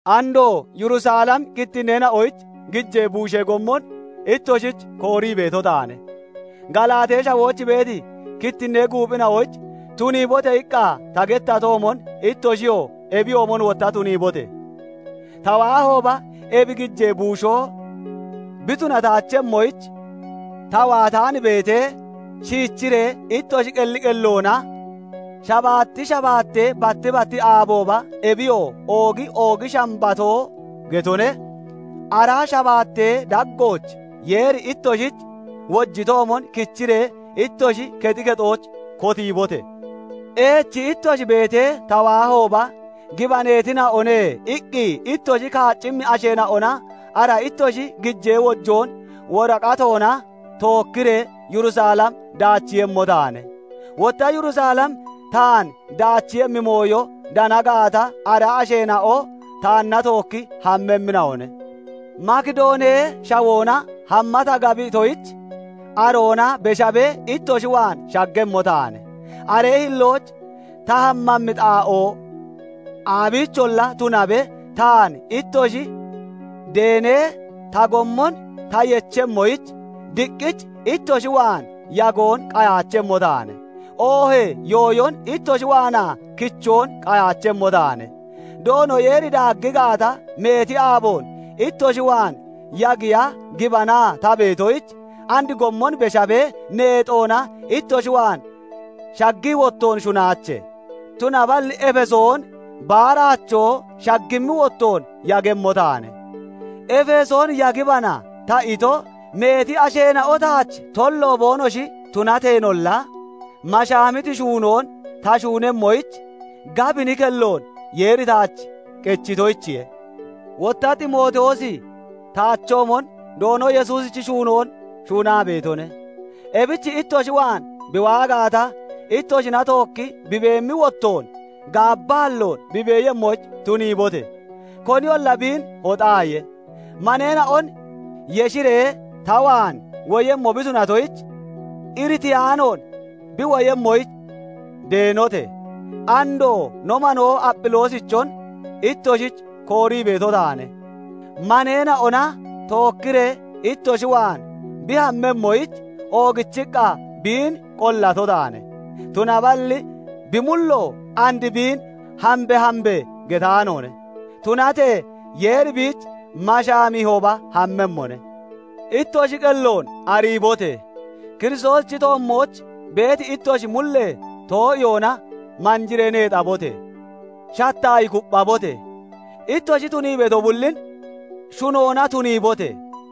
Andoo Yurisalemi kittinneena'oyich gijee buushee gommon ittoshich koorii beeto taane. Galaatee Shawooch beeti kittinnee guuphina'oyich "Tuniibote!" iqqa ta gettatoomon, ittoshiyoo ebiyoomon wotta tuniibote! Ta waahooba ebi gijee buushoo bi tunataachemmoyich, ta waataan beetee, shiichiree ittoshi qelli qelloona shabaatti shabaattee batti batti aabooba, ebiyoo oogi oogi shambatoo getone, ara shabaattee daggooch Yeeri ittoshich wojitoomon kichiree ittoshi kexi kexooch kotiibote! Eechi ittoshi beetee, ta waahooba, "Gibaneetina'one" iqqi ittoshi kaaccimmi asheena'ona ara ittoshi gijee wojoon woraqatoona tookkiree Yurisalem daachiiyemmo taane. Wotta Yurisalem taan daachiiyemmi mooyo dana gaata, ara asheena'o taanna tookki hammemmina'one. Makidoonee Shawoona hamma ta gabitoyich, aroona beshabee ittoshi waan shaggemmo taane. Aree hillooch ta hammemmi xaa'oo aabiicholla tunabe, taan ittoshi deenee ta gommon ta yechemmoyich, diqqich ittoshi waan yagoon qayaachemmo taane; oohee yooyon ittoshi waanaa kichoon qayaachemmo taane. Doono Yeeri daaggi gaata, meeti aaboon ittoshi waan yagiya gibanaa ta beetoyich, and gommon beshaabee neexoona ittoshi waan shaggii wottoon shunaache. Tunaballi Efesoon baaraachoo shaggimmi wottoon yagemmo taane. "Efesoon yagibana" ta ito, meeti asheena'o taach tollo boonoshi tunateenolla, mashaamiti shuunoon ta shuunemmoyich gabini kelloon Yeeri taach qechitoyichiye. Wotta Ximootiyoosi taachoomon Doono Yesuusichi shuunoon shuunaa beetone; ebich ittoshi waan bi waa gaata, ittoshina tookki bi beemmi wottoon gaabbaalloon bi beeyemmoyich tuniibote! Koniyolla biin hoxaaye! Maneena'on yeshiree ta waan woyemmo bi tunatoyich, iritiyaanoon bi woyemmoyich deenote! Andoo no manoo Aphiloosichon ittoshich koorii beeto taane; maneena'ona tookkiree ittoshi waan bi hammemmoyich oogichiqqa biin qollato taane; tunaballi bi mullo and biin "Hambe! Hambe!" getaanoone; tunatee Yeeri biich mashaamiihooba hammemmone. Ittoshi qelloon ariibote! Kiristoosichi toommooch beeti ittoshi mullee too'iyoona manjiree neexabote! Shattaayi kupphabote! Ittoshi tunii beeto bullin shunoona tuniibote!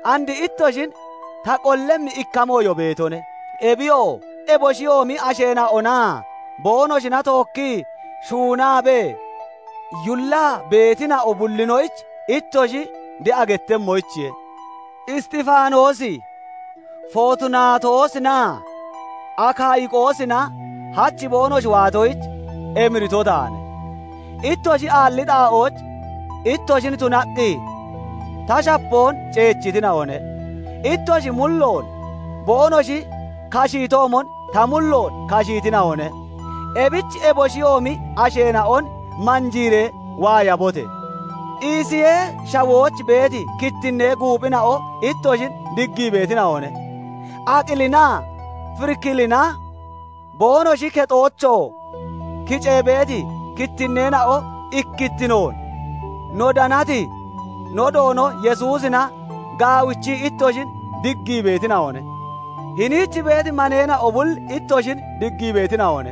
And ittoshin ta qollemmi ikka mooyo beetone; ebiyoo eboshiyoomi asheena'onaa boonoshina tookkii shuunaabee yullaa beetina'o bullinoyich ittoshi de'a gettemmoyichiye. Isxifaanoosi, Footunaatoosinaa Akayiqoosina hach boonoshi waatoyich emirito taane. Ittoshi aalli xaa'ooch ittoshin tunaqqi ta shapoon ceechitina'one. Ittoshi mulloon boonoshi kashiitoomon, ta mulloon kashiitina'one. Ebich eboshiyoomi asheena'on manjiiree waayabote! Isiyee Shawooch beeti kittinnee guuphina'o ittoshin diggii beetina'one. Aqilinaa Firikilina, boonoshi kexoochoo kicee beeti kittinneena'o ikkittinoon no danati no Doono Yesuusina gaawichii ittoshin diggii beetina'one. Hiniich beeti maneena'o bulli ittoshin diggii beetina'one.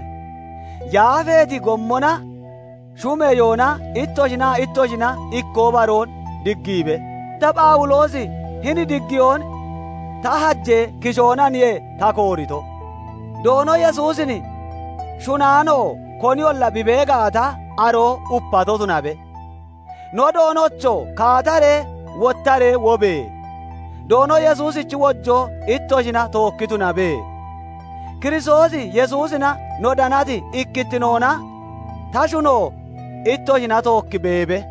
Yaafeeti gommona shumeyoona ittoshinaa ittoshina ikkoo baroon diggiibe. Ta, Phawuloosi hini diggiyoon ta hajee kishoonaniye ta koorito. Doono Yesuusin shunaano koniyolla bi bee gaata, aroo upato tunabe. No Doonocho! Kaata wottaree wobe! Doono Yesuusichi wojoo ittoshina tookki tunabe. Kiristoos Yesuusina no danati ikkittinoona ta shuno ittoshina tookki beebe.